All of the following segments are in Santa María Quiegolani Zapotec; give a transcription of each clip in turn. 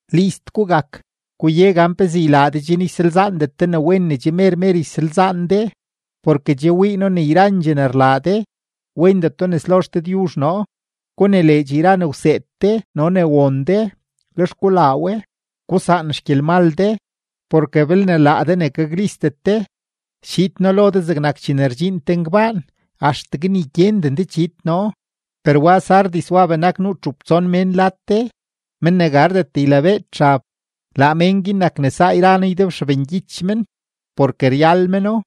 List gugak; guye gan pezee ylaa de chen ysalzaandet de ne wen ne che mer mer ysalzaan de; porke che wii noo ne yrandxee ne rlaa de, wendeto nes lo XDëdyuzh noo. Gunileedx yra ne wseed de no ne won de, lex gulaa we; gusaan xgyelmal de. Porke belne laa de ne gaklistet de, schiid noo lo de zegnak chene rdxiin te ngbaan, axtegue ni gyenden de chiid noo. Per wa Sardis wa benak nuu txup tson mén lad de, men ne gardet ylabeed xab. Laa men guin nak ne saa yra noo ydebxabngyich men, porke ryal meno.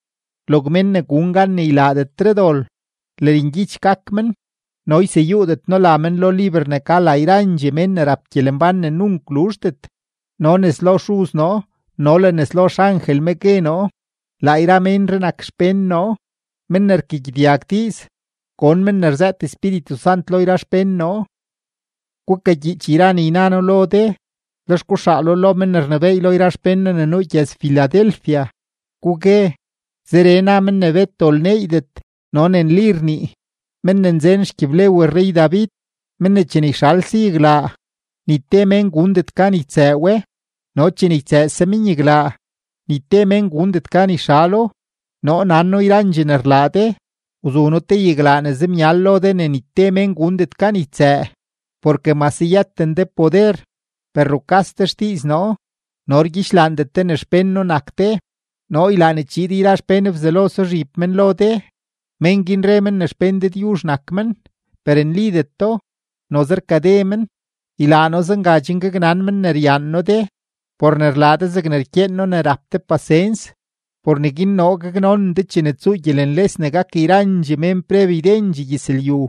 Log mén ne gun gan ne ylaadetre dol, lërngyich gak men no yseyuudet noo la men lo liber ne ka la yrandxee mén ne rap gyelembán ne nunk luzhdet, no nes lo Xuz noo no le nes lo xangel me gue noo: Laa yra ménree nak xpén noo. Men ne rkagyedyag diiz, gon men ne rzëët Espíritu Sant lo yra xpén noo.” ’Gukagyiich yra ne yna noo lo de, lex guxaalo lo men ne rnebééy lo yra xpén noo ne nuu gyëz-Filadelfia, gugue: “Zeree na men ne bet dol neeydet no ne nli rnii, men ne nzen xgyiblew rrey-David, men ne chene yxalse yaglaa, ni te mén gundet gan ytsëë we, no chene ytsëëse men yaglaa, ni te mén gundet gan yxalo: Noo nan noo yrandxee ne rlaa de. Wzu noo te yaglaa ne zemyal lo de ne ni te mén gundet gan ytsëë, porke mase yëten de poder, per rukas de xdiiz noo no rgyidxlaandet de ne xpén noo nak de. Noo ylaa ne chiid yra xpén Bzelo suzhib men lo de. Mén guin re men ne xpén Dëdyuzh nak men, per nlideto, noze rkade men; ylaa noo zenga chen gaknan men ne ryaan noo de. Por ne rlaa de zegne rkyeen noo ne rap de pasens, por neguin noo gaknonen de chene tsuu gyelenles ne gak yrandxee mén preb ydendxee gyëzlyu.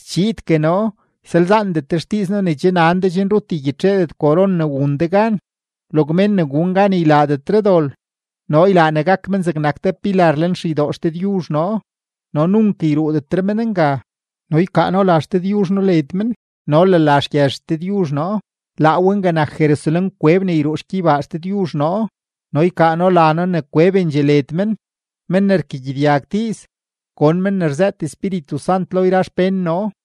Schiidgue noo. Ysalzaandet de xdiiz noo ne che nan de chen rut ygyitxeedet koron ne wun de gan. Log mén ne gun gan ne ylaadetre dol, noo ylaa ne gak men zegnak te pilar lenxeydoo XDëdyuzh noo, no nunk yruudetre men nga, no ykaa noo la XDëdyuzh noo led men no le la xgyëz XDëdyuzh noo, laa we nga nak Jerusalén-kweb ne yruu xgyeybaa XDëdyuzh noo, no ykaa noo la noo ne kwebendxee led men. Men ne rkagyedyag diiz, gon men ne rzëët Espíritu Sant lo yra xpén noo.”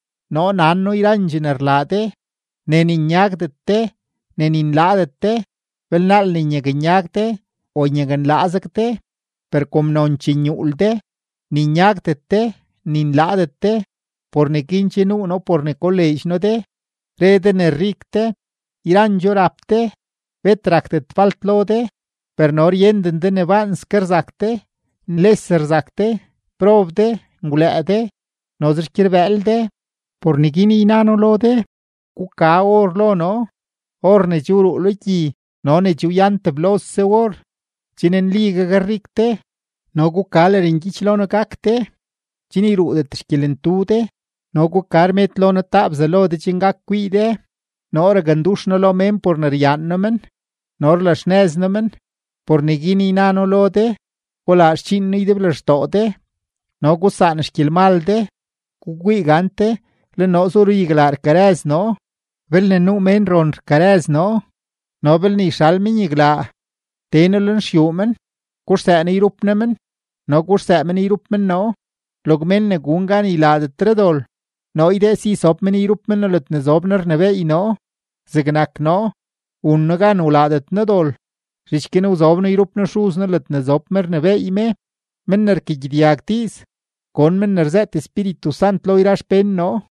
Noo nan noo yrandxee ne rlaa de, ne ni nyagdet de, ne ni nlaadet de. ¡Belnaal ne nyaknyag de o nyaknlaazeg de! Per kom nonchee nyuul de, ni nyagdet de, ni nlaadet de, por neguin che nuu noo por ne koleedx noo de. Re de ne rik de, yrandxoo rap de, bet rakdet falt lo de; per no ryenden de ne baanske rzak de, nles rzak de, prob de, ngwlëë de, noze xgyerbëël de. Por neguin yna noo lo de, guka or lo noo, or ne che wruu lo gyi no ne che wyan teblose or, chen nli gakrik de; no guka lërngyich lo noo gak de, chen yruudet xgyelentu de; no guka rmed lo noo taa bzalo de chen gak kwii de. Noo rakndux noo lo mén por ne ryaan noo men no rlaxnëz noo men. Por neguin yna noo lo de, gulaa xdxiin noo ydeblextoo de no gusaan xgyelmal de. Gukwii gante, le noo zu ruyaglaa rkarëz noo. Belne nuu mén ron rkarëz noo no belne yxal men yaglaa, tee noo lenxyuu men, guxsëë noo yrup noo men no guxsëë men yrup men noo. Log mén ne gun gan ne ylaadetre dol, noo ydee si sob men yrup men noo ledne zob noo rnebééy noo, zegnak noo, wun noo gan wlaadet noo dol, zhich guin wzob noo yrup noo Xuz noo ledne zob me rnebééy me. Men ne rkagyedyag diiz, gon men ne rzëët Espíritu Sant lo yra xpén noo.”